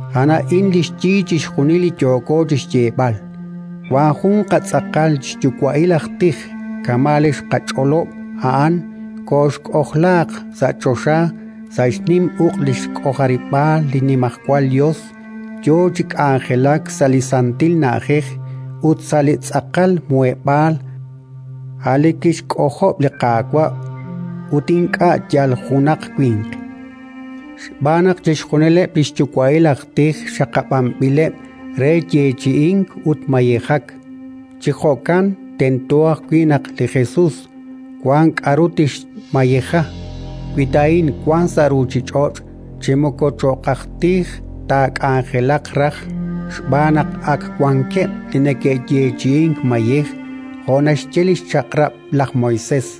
A'an a'in li xyi chixjunil li yooko chi xyeeb'al: wank jun qatz'aqal xyuwa'il aj tij kama' li xqach'olob'. A'an koxk'ojlaaq sa' choxa sa' xnim uq' li xk'ojarib'aal li Nimajwal Yos, yo chi k'anjelak sa' li santil Na'ajej ut sa' li tz'aqal Muheb'aal, a' li kixk'ojob' li Qaawa' ut ink'a' yal junaq winq. Xb'aan naq chixjunileb' li xyuwa'il aj tij xaqab'anb'ileb' re yeechi'ink ut mayejak: chi jo'kan tento ajwi' naq li Jesus wank k'aru tixmayeja. Wi ta a'in wank sa' ruuchich'och', chi moko cho'q aj tij taak'anjelaq raj, xb'aan naq ak wankeb' li neke'yeechi'ink mayej jo' naxye li xChaq'rab' laj Moisés.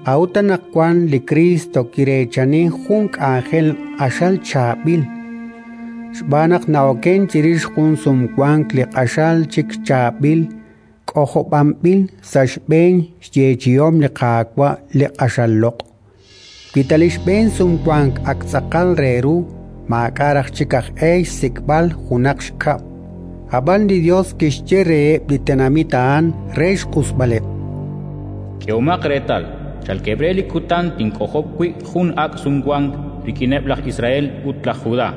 A'ut anaqwan li Kriist kireechani jun k'anjel q'axal chaab'il, xb'aan naq na'okenk chirix jun Sumwank li q'axal chik chaab'il, k'ojob'anb'il sa' xb'een xyeechi'om li Qaawa' li q'axal loq'. Wi ta li xb'een Sumwank ak tz'aqal re ru, maak'a' raj chik aj e xsik'b'al junaq xkab'. Ab'an li Yos kixye reheb' li tenamit a'an re xq'usb'aleb': “K'ehomaq reetal, chalkeb' re li kutan tink'ojob' wi' jun ak' Sumwank rik'ineb' laj Israel ut laj Judá: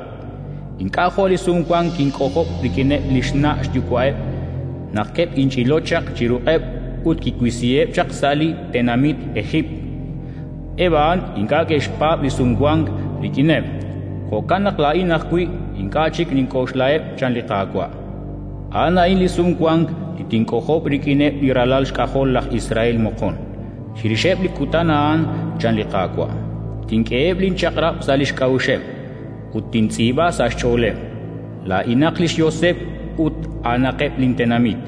ink'a' jo' li Sumwank kink'ojob' rik'ineb' li xna' xyuwa'eb', naq keb'inch'ilo chaq chi ruq'eb' ut kiwisiheb' chaq sa' li tenamit Ejiipt. Eb' a'an ink'a' ke'xpaab' linSumwank rik'ineb'; jo'kan naq laa'in ajwi' ink'a' chik kink'oxlaheb', chan li Qaawa'. A'an a'in li Sumwank li tink'ojob' rik'ineb' li ralal xk'ajol laj Israel moqon, chirixeb' li kutan a'an, chan li Qaawa': Tink'eheb' linchaq'rab' sa' li xk'a'uxeb', ut tintz'iib'a sa' xch'ooleb'. Laa'inaq li xYoseb' ut a'anaqeb' lintenamit.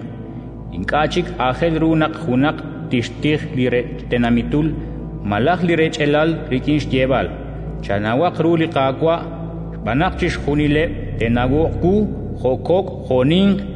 Ink'a' chik aajel ru naq junaq tixtij li rech tenamitul malaj li rech'alal rik'in xyeeb'al: «Chanawaq ru li Qaawa'!». Xb'aan naq chixjunileb' te'nawoq wu, jo' kok' jo' ninq.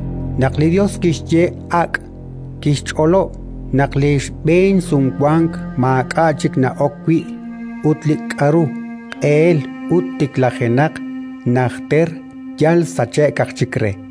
Naq li Yos kixye “ak'”, kixch'olob' naq li xb'een Sumwank maak'a' chik na'ok wi'; ut li k'aru q'eel ut tiklajenaq najter, yal sachk aj chik re.